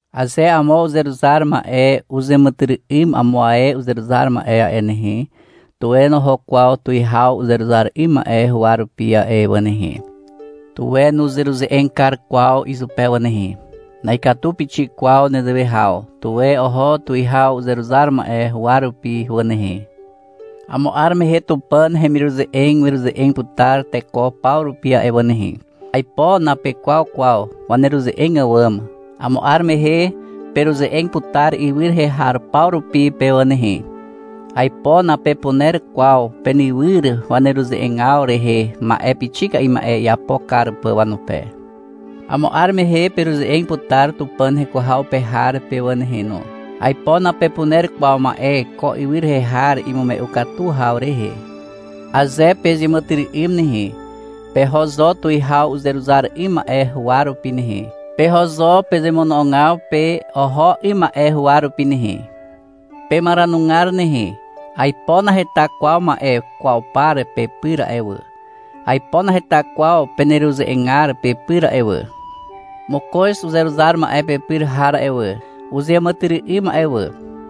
Aze amo uzeruzar ma'e uzàmàtyry'ym amo ae uzeruzar ma'e a'e nehe, tuwe noho kwaw tuwihaw uzeruzar 'ym ma'e huwa rupi a'e wà nehe. Tuwe nuzeruze'eg kar kwaw izupe wà nehe. Na'ikatu pixik kwaw nezewe haw. Tuwe oho tuwihaw uzeruzar ma'e huwa rupi wà nehe. Amo 'ar mehe Tupàn hemiruze'eg weruze'eg putar teko paw rupi a'e wà nehe. Aipo napekwaw kwaw waneruze'eg àwàm. Amo 'ar mehe peruze'eg putar ywy rehe har paw rupi pe wà nehe. Aipo napepuner kwaw penywyr waneruze'egaw rehe ma'e pixika'i ma'e iapo kar pà wanupe. Amo 'ar mehe peruze'eg putar Tupàn heko haw pe har pe wà nehe no. Aipo napepuner kwaw ma'e ko ywy rehe har imume'u katu haw rehe. Aze pezeàmàtyry'ym nehe, peho zo tuwihaw uzeruzar 'ym ma'e huwa rupi nehe. Peho zo pezemono'ogaw pe oho 'ym ma'e huwa rupi nehe. Pemaranugar nehe. Aipo naheta kwaw ma'e kwaw par pepyr a'e wà. Aipo naheta kwaw peneruze'egar pepyr a'e wà. — Mokoz uzeruzar ma'e pepyr har a'e wà, uzeàmàtyry'ym a'e wà.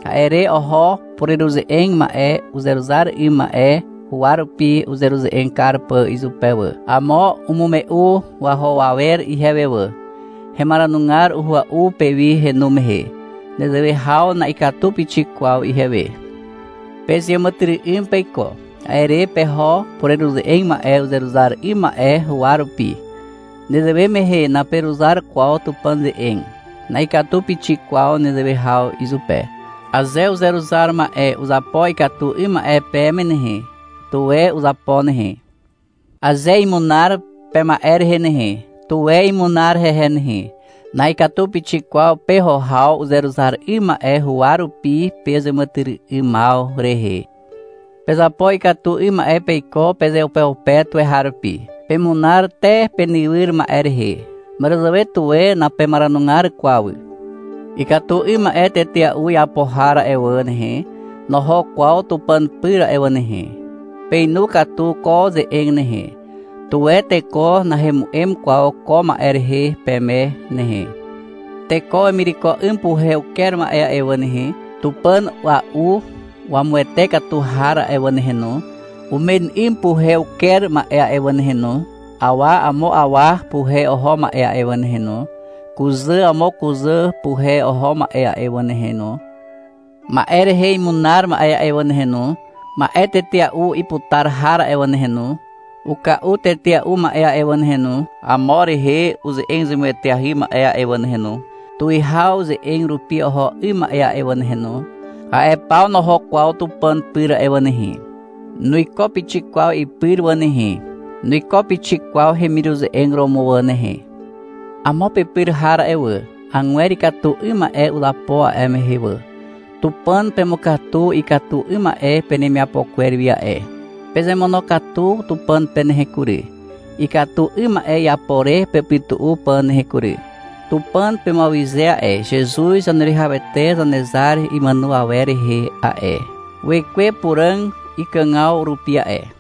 A'e re oho pureruze'eg ma'e uzeruzar 'ym ma'e huwa rupi uzeruze'eg kar pà izupe wà. Amo umume'u waho awer ihewe wà. Hemaranugar uhua'u pewi henu mehe. Nezewe haw na'ikatu pixik kwaw ihewe. Pezeàmàtyry'ym peiko. A'e re peho pureruze'eg ma'e uzeruzar 'ym ma'e huwa rupi. Nezewe mehe naperuzar kwaw Tupàn ze'eg. Na'ikatu pixik kwaw nezewe haw izupe. Aze uzeruzar ma'e uzapo ikatu 'ym ma'e peme nehe, tuwe uzapo nehe. Aze imunar pema'e rehe nehe, tuwe imunar hehe nehe. Na'ikatu pixik kwaw peho haw uzeruzar 'ym ma'e huwa rupi pezeàmàtyry'ymaw rehe. Pezapo ikatu 'ym ma'e peiko pezeupeupe tuweharupi. Pemunar te penywyr ma'e rehe. Màràzàwe tuwe napemaranugar kwaw. Ikatu 'ym ma'e tetea'u iapo har a'e wà nehe, noho kwaw Tupàn pyr a'e wà nehe. Peinu katu ko ze'eg nehe. Tuwe teko nahemu'em kwaw ko ma'e rehe peme nehe. Teko wemireko 'ym puhe uker ma'e wà nehe, tupàn a'ua'u wamuwete katu har a'e wà nehe no, umen 'ym puhe uker ma'e a'e wà nehe no, awa amo awa puhe oho ma'e a'e wà nehe no, kuzà amo kuzà puhe oho ma'e a'e wà nehe no, ma'e rehe imunar ma'e a'e wà nehe no, ma'e tetea'u iputar har a'e wà nehe no, uka'u tetea'u ma'e a'e wà nehe no, amo rehe uze'eg zemueteahy ma'e a'e wà nehe no, tuwihaw ze'eg rupi oho 'ym ma'e a'e wà nehe no, a'e paw noho kwaw Tupàn pyr a'e wà nehe. Nuiko pixik kwaw ipyr wà nehe. Nuiko pixik kwaw hemiruze'eg romo wà nehe. Amo pepyr har a'e wà, agwer ikatu 'ym ma'e uzapo a'e mehe wà. Tupàn pemukatu ikatu 'ym ma'e penemiapo kwer wi a'e. Pezemonokatu Tupàn pe nehe kury, ikatu 'ym ma'e iapo re pepytu'u pà nehe kury. Tupàn pemuawyze a'e, Zezuz Zaneruwihawete Zanezar imàno awer rehe a'e, Wekwe Puràg ikàgaw rupi a'e.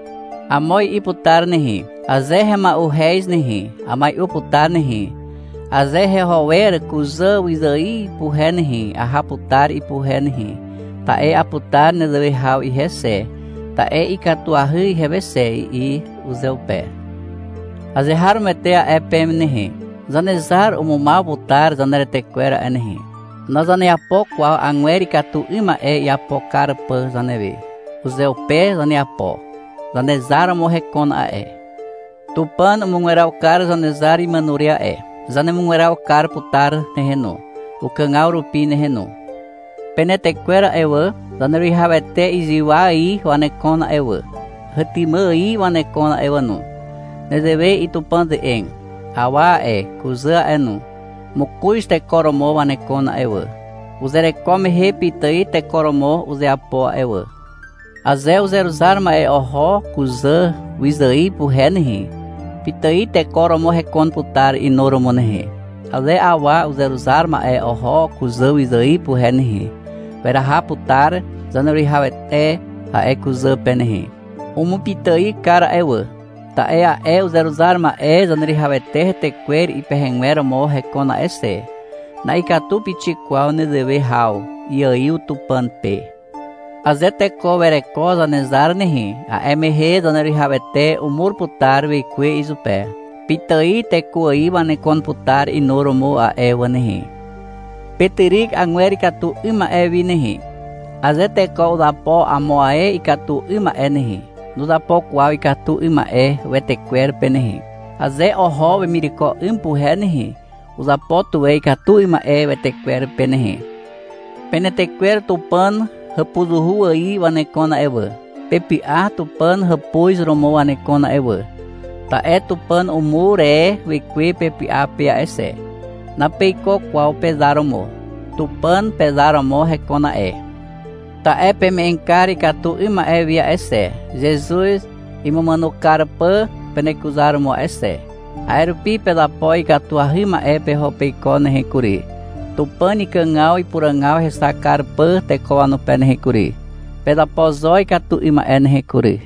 Amo i'i putar nehe. — Aze hema'uhez nehe, amai'u putar nehe, aze heho wer kuzà wyzài puhe nehe, aha putar ipuhe nehe, ta'e aputar nezewe haw ihe xe, ta'e ikatuahy ihewe xe, i'i uzeupe. Azeharomoete a'e peme nehe. Zanezar umumaw putar zaneretekwer a'e nehe. Nazaneapo kwaw agwer ikatu 'ym ma'e iapo kar pà zanewe. Uzeupe zaneapo. Zanezar romo hekon a'e. Tupàn umugweraw kar Zanezar imàno re a'e. Zanemugweraw kar putar nehe no, ukàgaw rupi nehe no. Penetekwer a'e wà, Zaneruwihawete zywa ài wanekon a'e wà, hetymà ài wanekon a'e wà no. Nezewe i'i Tupàn ze'eg. — Awa a'e, kuzà a'e no, mokoz teko romo wanekon a'e wà. Uzereko mehe pitài teko romo uzeapo a'e wà. Aze uzeruzar ma'e oho kuzà wyzài puhe nehe, pitài teko romo hekon putar inuromo nehe. Aze awa uzeruzar ma'e oho kuzà wyzài puhe nehe, weraha putar Zaneruwihawete a'e kuzà pe nehe. Umupitài kar a'e wà, ta'e a'e uzeruzar ma'e Zaneruwihawete hetekwer ipehegwer romo hekon a'e xe. Na'ikatu pixik kwaw nezewe haw. Iaiw Tupàn pe. Aze teko wereko Zanezar nehe, a'e mehe Zaneruwihawete umur putar Wekwe izupe. Pitài teko ài wanekon putar inuromo a'e wà nehe. Petyryk agwer ikatu 'ym ma'e wi nehe. Aze teko uzapo amo ae ikatu 'ym ma'e nehe, nuzapo kwaw ikatu 'ym ma'e wetekwer pe nehe. Aze oho wemireko 'ym puhe nehe, uzapo tuwe ikatu 'ym ma'e wetekwer pe nehe. Penetekwer Tupàn hàpuzuhu ài wanekon a'e wà. Pepy'a Tupàn hàpuz romo wanekon a'e wà, ta'e Tupàn umur e Wekwe pepy'a pe a'e xe. Napeiko kwaw pezar romo. Tupàn pezar romo hekon a'e. Ta'e peme'eg kar ikatu 'ym ma'e wi a'e xe, Zezuz imumàno kar pà penekuzaromo a'e xe. A'e rupi pezapo ikatuahy ma'e peho peiko nehe kury, Tupàn ikàgaw ipuràgaw hexak kar pà teko wanupe nehe kury. Pezapo zo ikatu 'ym ma'e nehe kury.